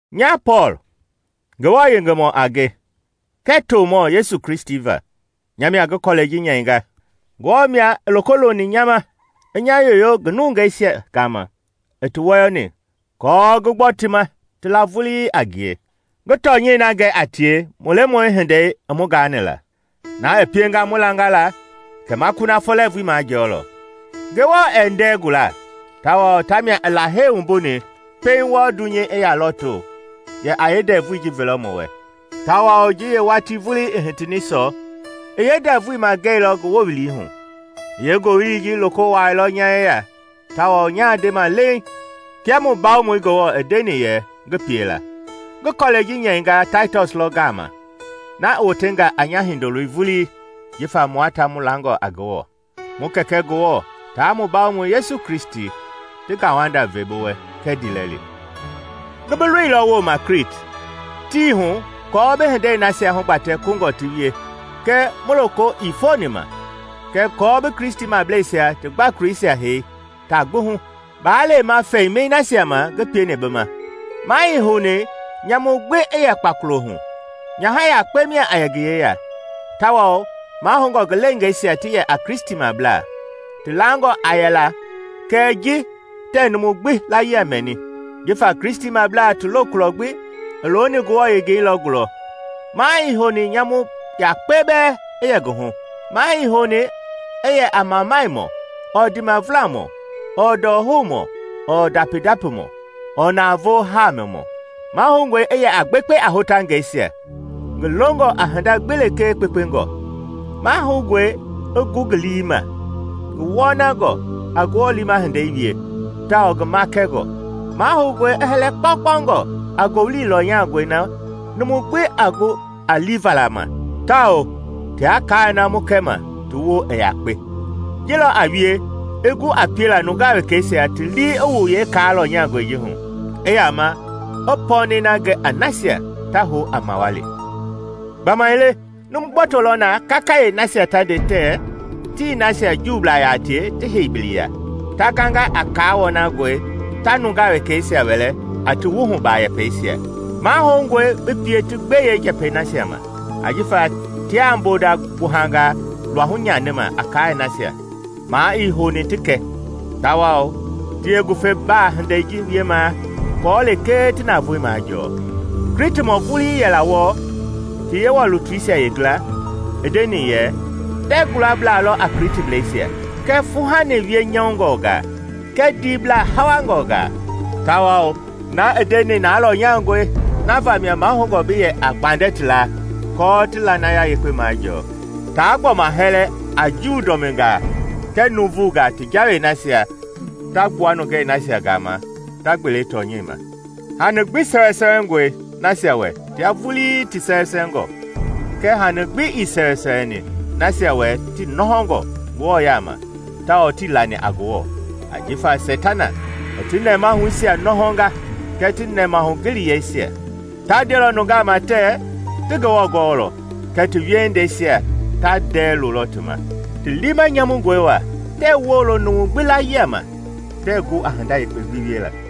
Nya Pɔɔl, Ngewɔ yengemɔ a nge kɛɛ tomɔ Yesu Kristi va, nya mia ngi kɔlɛi ji nyɛinga. Ngewɔ mia i loko loni nya ma i nya yoyo ngi nungei nasia gama i ti wɔyɔni kɔɔ ngi gbɔ ti ma ti la vulii a ngie, ngi tɔnyɛi na gɛ a tie mu Yewɔ-hindei i mu gaani la, na i pienga mu langa la kɛ ma kunafɔ lɛɛvui majɔɔlɔ. Ngewɔ ɛɛ ndɛɛ guala, tawao tamia i Lahei wumbuni pɛiŋ wɔɔ dunyei i yaa lɔɔto yɛ a yeendɛvui ji velɔ mu wɛ, tawao ji yeewatii vulii i hitini sɔ, i yeendɛvui magɛilɔ ngi wowili hu. I yeengowili ji loko wuaailɔ nya yeya tawao nyaa ndema leiŋ kia mu Bawomɔi Ngewɔ i ndeni yɛ ngi pie la. Ngi kɔlɛi ji nyɛinga Taitɔs lɔ gaama na i wotenga a nya hindoloi vulii jifa mua ta mu langɔ a Ngewɔ. Mu Kɛkɛ Ngewɔ taa mu Bawomɔi Yesu Kristi ti ngauwanda ve bi wɛ kɛɛ ndiilɛli. Ngi bi loilɔ wooma Kliti tii hu kɔɔ bi hindei nasia hugbatɛ kungɔ ti wie kɛɛ mu loko ii foni ma, kɛɛ kɔɔ bi Kristimableisia ti gbakoleisia hei taa gbi hu. Baa lema fɛimɛi nasia ma ngi pieni bi ma, maa ii houni nyamu gbi i yɛ kpakolo hu; nyaha yakpe mia a yɛ ngi yeya, tawao mahoungɔ ngi leengeisia ti yɛ a Kristimablaa, ti langangɔ aa yɛla kɛɛ ji tɛɛ numu gbi laayia mɛni. Jifa Kristimablaa ti lokulɔ gbi i looni Ngewɔ yengei lɔ gulɔ, maa ii houni nyamu yakpe bɛɛ i yɛ ngi hu. Maa ii houni i yɛ a mamanimɔ ɔɔ ndiimavulamɔ, ɔɔ ndɔhoumɔ, ɔɔ ndapi-ndapimɔ, ɔɔ navoo haamimɔ. Mahoungɔe i yɛ a gbekpe a hotangɛisia, ngi longɔ a hinda gbi lekee kpekpengɔ. Mahoungɔe i gu ngi lii ma, ngi wɔnangɔ, a Ngewɔ liima hindei wie, tawao ngi makɛngɔ. Mahoungɔe i hɛlɛ kpaukpau a ngowili lɔnyangɔi na numu a gu a liivala ma tawao tia kaai na mu kɛma ti woo i yakpe. Ji lɔ a wie i gu a piela nungaa wekɛisia ti lii i wu yeekaa lɔnyangɔi ji hu, i yama i pɔɔnɛi na gɛ a nasia ta hou a mawali. Gbamaile numu gboto lɔ na kakayee nasia ta nde tɛ ti nasia Juublaa yaa tie hei biliya, ta ganga a kaa wɔnangɔi ta nungaa wekɛisia wɛlɛ a ti wuhuba yɛpɛisia. Mahoungɔe bi pie ti gbe yeenjɛpɛi nasia ma, ajifa tiaa mbonda gbuhangaa luahu nyanima a kaai nasia maa ii houni ti kɛ, tawao ti yeengufebaa hindei ji wiemaa aako lekee ti navoei majɔɔ. Klitimɔ vulii yɛla wɔɔ, ti Yewɔ lutuisia yeengila, i ndeni yɛ, “Ndɛɛ gulabla lɔ a Klitiblɛisia kɛɛ fuuhani wienyɔungɔngaa kɛɛ ndiiblaa hawangɔngaa.” Tawao na i ndeni na lɔnyangɔi na vamia mahoungɔ bi yɛ a gbandɛ ti laa aako ti lanaya yekpe majɔɔ; taa gbɔma hɛlɛ a Juu dɔmingaa kɛɛ nuuvungaa ti jawei nasia ta gbua nungei nasia gama ta gbele tɔnyɛi ma. Hani gbi sɛwɛsɛwɛngɔe nasia wɛ tia vulii ti sɛwɛsɛwɛngɔ; kɛɛ hani gbi ii sɛwɛsɛwɛni nasia wɛ ti nɔhɔngɔ Ngewɔ yaama tawao tii lani a Ngewɔ, ajifa Seitana i ti nɛmahuisia nɔhɔnga kɛɛ ti nɛmahugiliyeisia. Ta ndelɔ nungaa ma tɛɛ ti Ngewɔ gɔɔlɔ, kɛɛ ti wiehindeisia ta ndɛɛ lolɔ ti ma. Ti liima nyamungɔe wa, tɛɛ woolo numu gbi laayia ma, tɛɛ gu a hinda yekpe gbi wiela.